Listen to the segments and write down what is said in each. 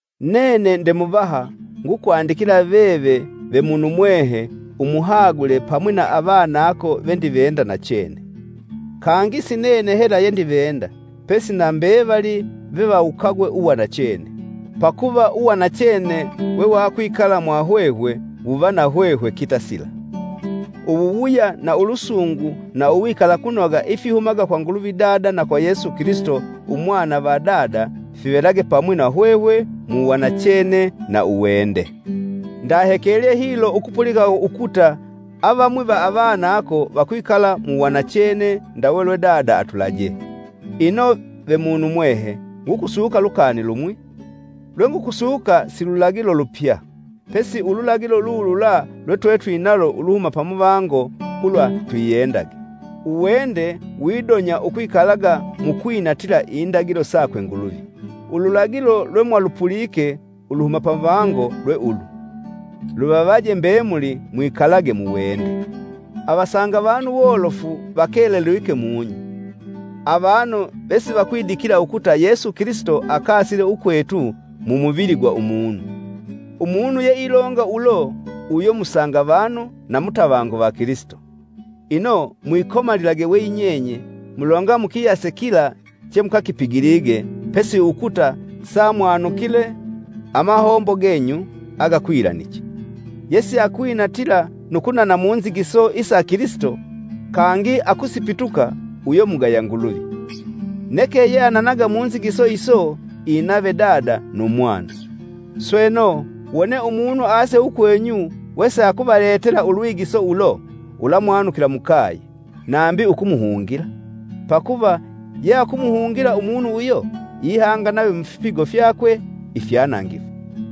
Nene nde muvaha ngukwandikila veve ve munumwehe umuhagule pamwi na avanako vendivenda nachene. Kangi si nene hela yendivenda, pesi na mbevali vevawukagwe uwanachene, pakuva uwanachene wewakwikala mwahwehwe wuva na hwehwe kitasila. Uwuwuya na ulusungu na uwikalakunoga ifihumaga kwa Nguluvi Dada na kwa Yesu Kilisito, Umwana va Dada, fivelage pamwi na hwehwe mu wanachene na uwende. Ndahekelye hilo ukupulika ukuta avamwi va avanako vakwikala mu wanachene ndawe lwe Dada atulajee. Ino, ve munumwehe ngukusuka lukani lumwi: lwengukusuka si lulagilo lupya, pesi ululagilo lulula lwetwetwinalo uluhuma pamuvango ulwa twiyendage. Uwende widonya ukwikalaga mu kwinatila indagilo sakwe Nguluvi. Ululagilo lwemwalupulike uluhuma pamuvango lwe ulu: luvavaje mbemuli mwikalage mu wende. Avasangavanu wolofu vakelelwike mung'i, avanu vesivakwidikila ukuta Yesu Kilisito akasile ukwetu, mu muvili gwa umunu. Umunu yeilonga ulo uyo musanga vanu na mutavangu va Kilisito. Ino, mwikomalilage we yinyenye mulonga mukiyase kila chemukakipigilige, pesi ukuta samwanukile amahombo genyu agakwilaniche. Yesiakwinatila nu kunana munzigiso isa Kilisito, kangi akusipituka uyo mugaya Nguluvi. Neke yeananaga mu nzigiso iso inave Dada nu Mwana. Sweno, wone umunu aase ukwenyu wesiakuvaletela ulwigiso ulo, ulamwanukila mukaye, nambi ukumuhungila. Pakuva yeakumuhungila umunu uyo, ihanga nave mufipigo fyakwe ifyanangifu.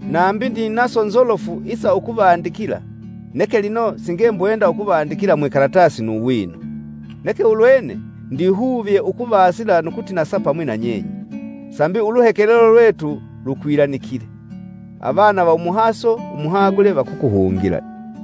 Nambi ndinaso nzolofu isa ukuvandikila, neke lino singembwenda ukuvandikila mwikalatasi nu wino, neke ulwene, ndihuvye ukuvasila nu kutinasa pamwi na nyenye, sambi uluhekelelo lwetu lukwilanikile. Avana va umuhaso umuhagule, vakukuhungila.